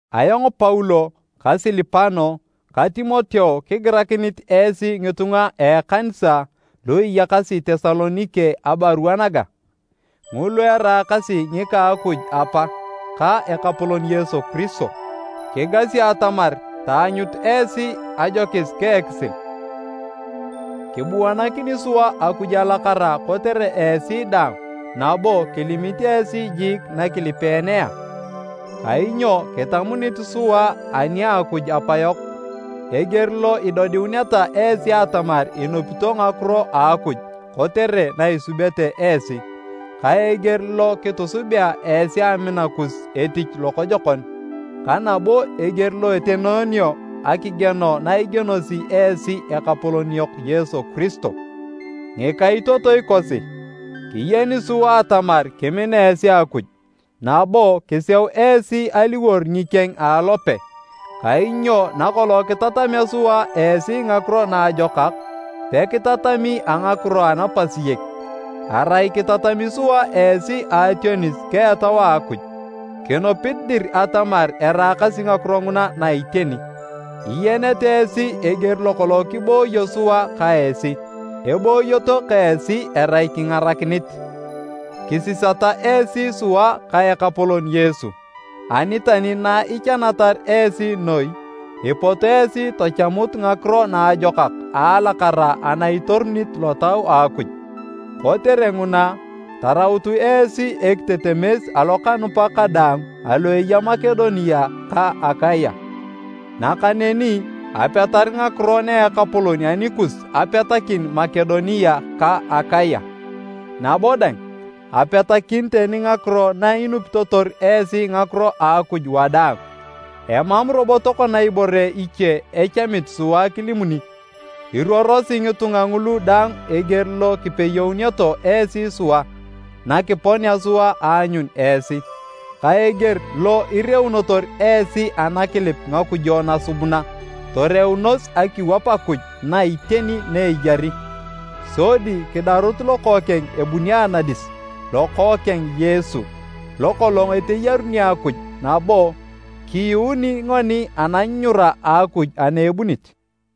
Ayong Paulo ka Silipano ta Timoteo kigirakinit esi ngitunga a ekanisa lu iyakasi Tesalonike abarua naga. Ngulu eraakasi ngika a Akuj Apa ka Ekapolon Yesu Kiristo. Kigasi atamar taanyut esi ajokis ka ekisil. Kibuanakini sua Akuj alakara kotere esi daang nabo kilimit esi jiik nakilipeenea. Kainyo kitamunit sua ani a Akuj Apayok eger lo idodiuneta esi atamar inupito ngakiro a Akuj kotere na isubete esi, ka eger lo kitusubea esi amina kus etich lokojokon, ka nabo eger lo etenoonio akigieno na igienosi esi Ekapolon yok Yesu Kiristo. Ngikaitotoi kosi, kiyeni sua atamar kimina esi Akuj nabo kiseu esi aliwor ngikeng a alope. Kainyo nakolong kitatamea sua esi Ngakiro Naajokak, pekitatami a ngakiro anapasiyek. Arai kitatami sua esi a ationis ka Etau a Akuj, kinupit dir atamar eraakasi ngakiro nguna na iteni. Iyenete esi eger lokolong kibooyo sua ka esi, ebooyoto ka esi erai kingarakinit. Kisisata esi sua ka Ekapolon Yesu, ani tani na ichanatar esi noi, ipot esi tachamut ngakiro naajokak a alakara ana itorunit Lotau a Akuj. Kotere nguna, tarautu esi ekitetemes alokanupak kadaang alu eya Makedonia ka Akaya. Nakaneni apetar ngakiro na Ekapolon anikus apetakin Makedonia ka Akaya, nabo dang, apetakin tani ngakiro na inupitotor esi ngakiro a Akuj wadaang. Emam robo tokona ibore iche echamit sua kilimuni. Iruorosi ngitunga ngulu daang eger lo kipeyeuneto esi sua nakiponea sua aanyun esi, ka eger lo ireunotor esi anakilip ngakujo nasubuna, toreunos akiwap Akuj na iteni na eyari sodi kidarut Lokookeng ebuni anadis, Lokookeng Yesu, lokolong eteyaruni Akuj nabo kiyuuni ngoni ananyunyura a Akuj ana ebunit.